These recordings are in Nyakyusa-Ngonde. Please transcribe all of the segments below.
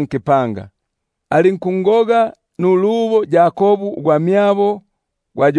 nkipanga. Alinkungoga nulubo Yakobu ugwamyabo gwa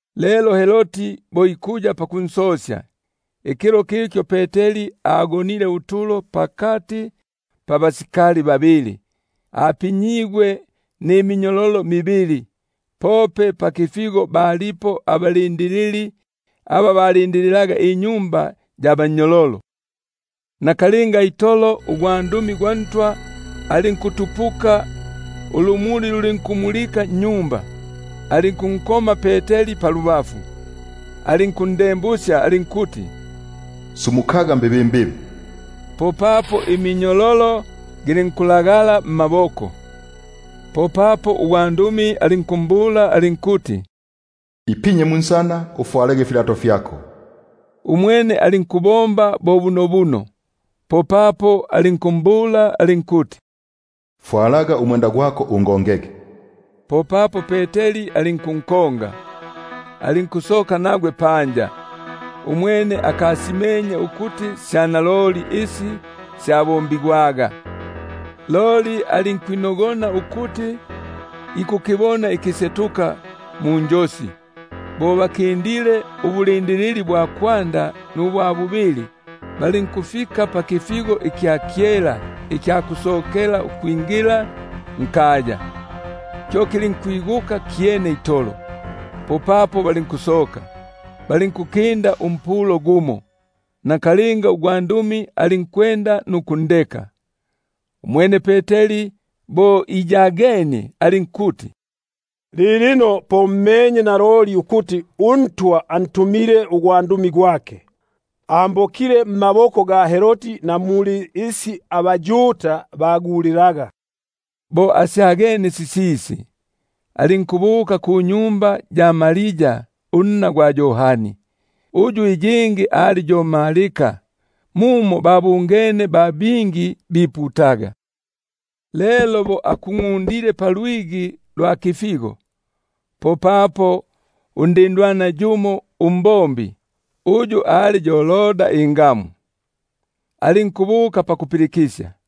Lelo Herodi bo ikuya pakunsosya, ikilo kikyo Peteri agonile utolo pakati pabasikali babili, apinyigwe mminyololo mibili; pope pakifigo balipo abalindilili aba balindililaga inyumba ya bannyololo. Nakalinga itolo ugwandumi gwa Ntwa alinkutupuka, ulumuli lulinkumulika nnyumba; alinkunkoma Peteri palubafu, alinkundembusya alinkuti: Sumukaga mbibimbibi. Popapo minyololo gilinkulagala mmaboko. Popapo ugwandumi alinkumbula alinkuti: Ipinya munsana, ufwalege ifipapa fyako; umwene alinkubomba bo bunobuno. Popapo alinkumbula alinkuti: Fwalaga ikilundo kyako, ungongege. Popapo alinkusoka panja alinkunkonga. Umwene akasimenye ukuti sya naloli isi syabombigwaga nugwandumi, loli alinkwi- nogona ukuti akibwene ikisetuka. Bo bakindile ubulindilili bwa kwanda nubwa bubili, balinkufika pakipata ikya kyela ikya kusokela ukwingila nkaya, kyo kilinkwiguka kyene itolo; popapo balinkusoka, balinkukinda umpulo gumo, nakalinga ugwandumi alinkwenda nukundeka. Umwene Peteri bo iyagenie alinkuti: Lilino po mmenye naloli ukuti uNtwa antumile ugwandumi gwake, ambokile mmaboko ga Herodi na muli isi abaYuda bagulilaga. Umwene bo asyagenie, alinkubuka kunyumba ya Maria unna gwa Yohani, uyu iyingi ali yo Marko; muno babungene ba bingi biputaga. Lelo bo akungʼundile palwigi lwa kifigo, popapo undindwana yumo umbombi, uyu ali yo Roda ingamu, alinkubuka pakupilikisya.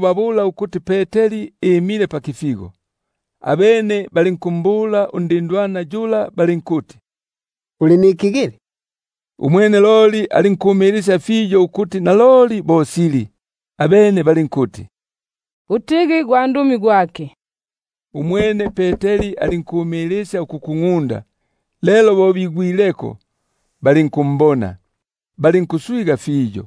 babula ukuti Peteri imile pakifigo. Abene balinkumbula balinkuti: Uli nikigili. Umwene loli alinkumilisya fiyo ukuti naloli bo sili. Abene balinkuti: Utigi gwandumi gwake. Umwene Peteri alinkumilisya ukukungʼunda. Lelo bo bigwileko, balinkumbona, balinkuswiganika fiyo.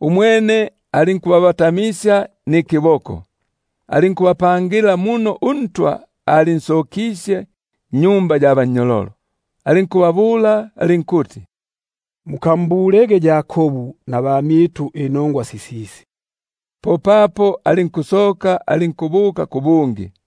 Umwene alinkubabatamisya nikiboko, alinkubapangila muno uNtwa alinsokisye nnyumba ya bannyololo, alinkubabula alinkuti: Mukambulege Yakobu nabamyitu inongwa sisisi. Popapo alinkusoka, alinkubuka kubungi.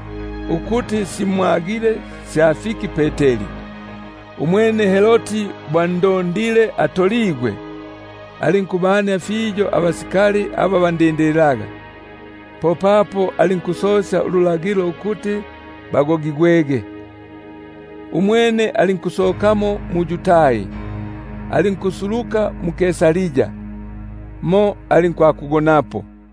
ukuti simwagile sya fiki Peteri. Umwene Herodi bo andondile atoligwe, alinkubania fiyo abalindilili; popapo alinkulagila ukuti bagogigwege. Umwene alinkusokamo mu-Yudai alinkusuluka mu-Kaisaria, mo alinkwakugonapo. Ukufwa kwa Herodi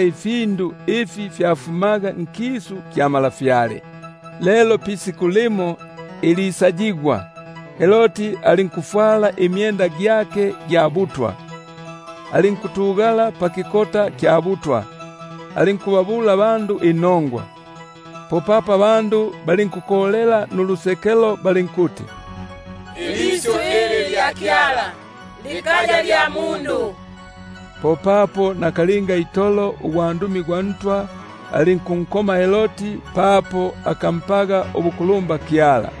ifyakulya ifi fyafumaga nkisu kya ntwa. Lelo pisiku limo isaligwa, Herodi alinkufwala imyenda gyake gya butwa, alinkutugala pakikota kya butwa, alinkubabula abandu inongwa. Popapo abandu balinkukolela balinkuti: Lyo isyu lya kyala, likaya lya mundu. Loli nakalinga itolo ugwandumi gwa Ntwa alinkunkoma, papo akampaga ubukulumba Kyala;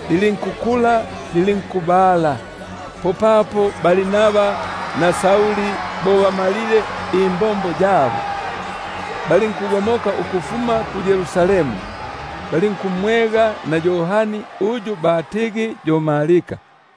lilinkukula, lilinkubala. Popapo Barnaba na Sauli bo bamalile imbombo yabo, balinkugomoka ukufuma mu-Yerusalemu; balinkumwega na Yohani uyu batigi yo Marko.